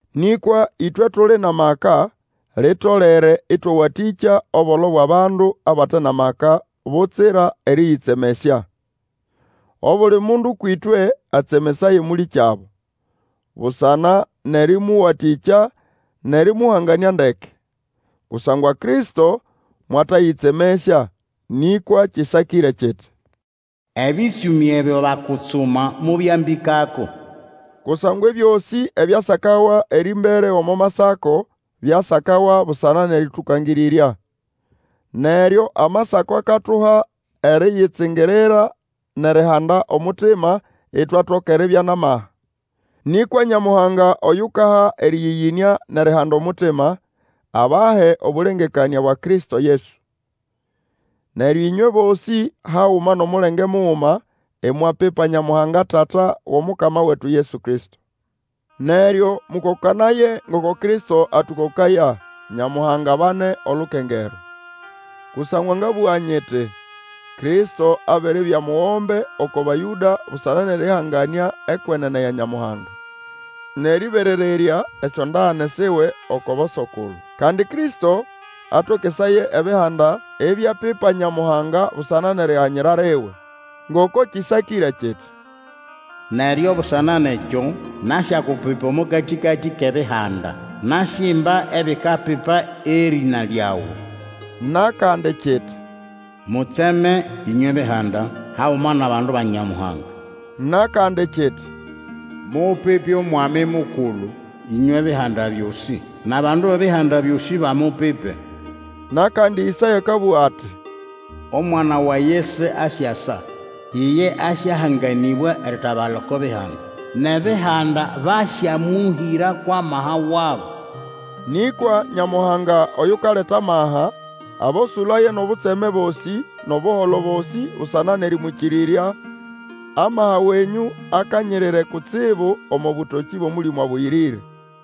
Nĩkwa ĩtwe tuli nʼamaka, litolere ĩtwawatĩkya obolo bwʼabandu abate nʼamaka, butsira erĩyĩtsemesya. Obuli mundu kwĩtwe atsemesaye mũlĩkyabo, busana nʼerĩmũwatĩkya nʼerĩmũhanganĩa ndeke. Kusangwa Kristo mwatayĩtsemesya; nĩkwa kĩsakĩre kiti, Ebĩtsũmĩ ebyo bakutsuma mobyambĩkako. Kusangwa ebyosĩ ebyasakawa erĩmbere omo Masako byasakawa busana nʼerĩtũkangĩrĩrya. Neryo Amasako akatuha eriyitsingirira nʼerihanda omutima, itwatoka eribya nʼamaha. Nĩkwa Nyamuhanga oyukaha erĩyĩyĩnĩa nʼerihanda omutima, abahe obũlengekanĩa bwa Kristo Yesu. Neryo ĩnywe bosĩ haguma nʼomulenge muguma, imwapipa Nyamuhanga Tata wʼOmukama wetu Yesu Kristo. Neryo mũkokanaye ngoko Kristo atũkokaya, Nyamuhanga abane olukengerwa. Kusangwa ngabũga nyiti, Kristo abiribya omugombe oko Bayũda busana nʼerĩhanganĩa ekwenene ya Nyamuhanga, nʼerĩberererya esyondagane siwe oko boso-kulu. Kandi Kristo atokesaye ebihanda ibyapipa Nyamuhanga busana nʼeriganyira liwe. Ngoko kĩsakĩre kiti, Neryo busana nʼekyo, nasyakupipa omo katĩkati kʼebihanda, Nasyimba ebikapipa erĩna lyawe. Nʼakandi, kiti, Mutseme, ĩnywe Bihanda, haguma nʼabandu ba Nyamuhanga. Nʼakandi, kiti, Mupipe Omwami Mukulu, ĩnywe Bihanda byosĩ, Nʼabandu bʼebihanda byosĩ bamupipe! Nʼakandi Ĩsaya akabũga ati, Omwana wa Yese asyasa, Iye asyahanganĩbwa eritabala oko Bihanda. Nʼebihanda basyamũhĩra kwʼamaha wabo. Nĩkwa Nyamuhanga, oyukaleta maha, abosũlaye nʼobutseme bosĩ nʼobuholo bosĩ busana nʼerĩmwĩkĩrĩrya, amaha wenyũ akanyirire kutsibu omo bũtokĩ bwʼOmũlĩmũ Abũyĩrĩre.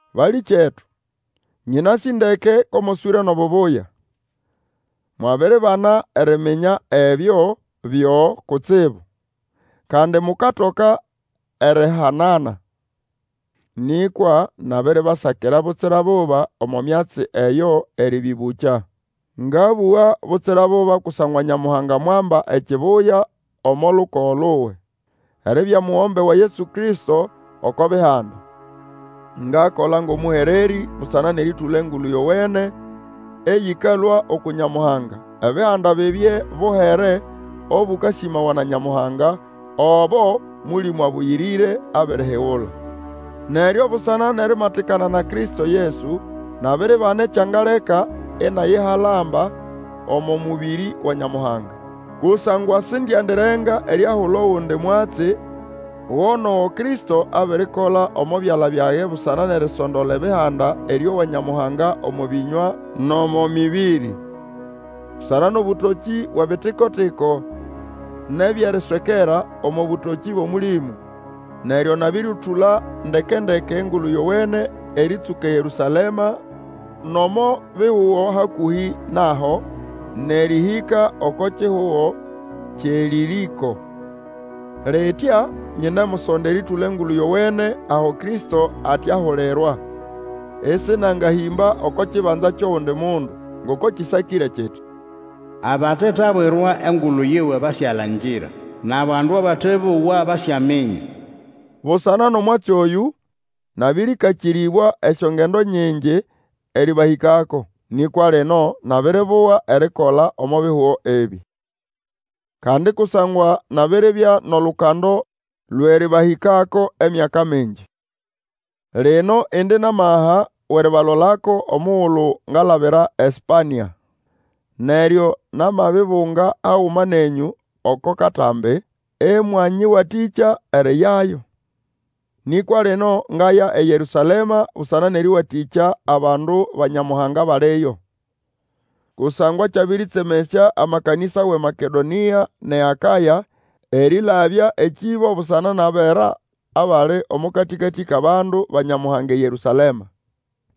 Balĩkyetu, nyĩnasĩ ndeke ko moswĩre nʼobubuya, mwabiribana eriminya ebyo byo kutsibu, kandi mukatoka erihanana. Nĩkwa nabiribasakira butsira buba omo myatsi eyo erĩbĩbũkya. Ngabũga butsira buba kusangwa Nyamuhanga mwamba ekibuya omo lukogo luwe, eribya mugombe wa Yesu Kristo oko Bihanda. Ngakola ngʼomũhererĩ busana nʼerĩtũla Engulu Yowene eyĩkalũa uku Nyamuhanga, Ebihanda bibye buhere obũkasĩmawa na Nyamuhanga, obo Mũlĩmũ Abũyĩrĩre abirihigula. Neryo busana nʼerimatikana na Kristo Yesu nabiribana ekyangaleka inayihalamba omo mũbĩrĩ wa Nyamuhanga. Kusangwa sindiendirenga eriahula ogundi mwatsi go nʼogo Kristo abirikola omo byala byage busana nʼerisondola Ebihanda erĩowa Nyamuhanga omo bĩnywa nʼomo mĩbĩrĩ, busana nʼobũtokĩ bwʼebitiko-tiko nʼebyʼeriswekera, omo bũtokĩ bwʼOmũlĩmũ. Neryo nabĩrĩtũla ndeke-ndeke Engulu Yowene erĩtsũka eYerũsalema nʼomo bihugo hakũhĩ naho, nʼerĩhĩka oko kihugo kyʼeĨlĩrĩko. Litya nyinemusonda erĩtũla Engulu Yowene aho Kristo ate ahulirwa, ĩsĩnangahĩmba oko kibanza kyʼogundi mundu. Ngoko kĩsakĩre kiti, Abatetabwirwa engulu yiwe, basyalangira, Nʼabandu abate bowa, basyaminya. Busana nʼomwatsi oyũ, nabĩrĩkakĩrĩbwa esyongendo nyingi erĩbahĩkako. Nĩkwa lino nabiribuga erikola omo bihugo ebĩ. Kandi kusangwa nabiribya nʼolukando lwʼerĩbahĩkako emyaka mingi, lino indi nʼamaha wʼeribalolako omugulu ngalabira eSpania. Neryo namabibunga haguma nenyũ oko katambĩ, ĩmwanyĩwatĩkya eriyayo. Nĩkwa lino ngaya eYerũsalema busana nʼerĩwatĩkya abandu ba Nyamuhanga abaliyo. Kusangwa kyabĩrĩtsemesya amakanĩsa wʼeMakedonĩa nʼeAkaya erĩlabya ekĩbo busana nʼabera abali omo katĩkatĩ kʼabandu ba Nyamuhanga eYerũsalema.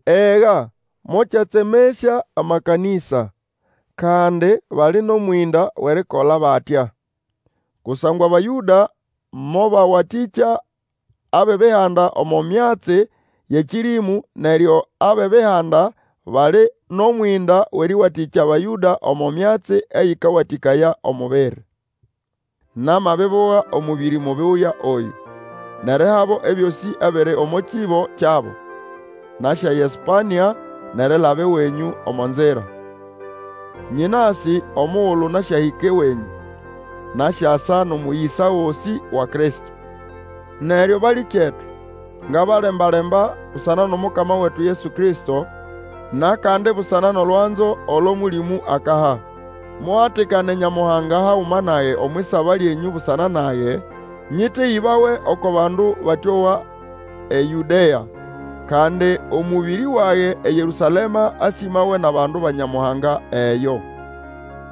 Ega mokyatsemesya amakanĩsa, kandi bali nʼomwĩnda wʼerikola batya. Kusangwa Abayũda mobawatĩkya abʼEbihanda omo myatsi yʼekĩrĩmũ neryo abʼEbihanda bali nʼomwĩnda wʼerĩwatĩkya Abayũda omo myatsi eyĩkawatĩkaya omubiri. Namabibuga omũbĩrĩ mubuya oyũ, nʼerihabo ebyosĩ ebiri omo kĩbo kyabo, nasyaya eSpania, nʼerilaba ewenyũ omo nzira. Nyĩnasĩ omugulu nasyahĩka ewenyũ, nasyasa nʼomũyĩsa gosĩ wa Kristo. Neryo balĩkyetu, ngabalembalemba, busana nʼomukama wetu Yesu Kristo, nʼakandi busana nʼolwanzo olo Mũlĩmũ akaha, muhatikane Nyamuhanga haguma nage omwʼisaba lyenyũ busana nage, nyĩteyĩbawe oko bandu batĩowa eYũdea; kandi omũbĩrĩ wage eYerũsalema asĩmawe nʼabandu ba Nyamuhanga eyo.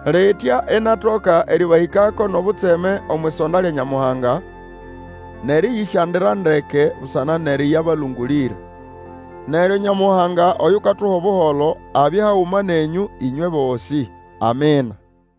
Litya inatoka erĩbahĩkako nʼobutseme omwʼisonda lya Nyamuhanga, nʼerĩyĩsyandira ndeke busana nʼerĩyabalũngũlĩra. Neryo Nyamuhanga oyukatuha Obuholo abye haguma nenyũ ĩnywe bosĩ. Amina.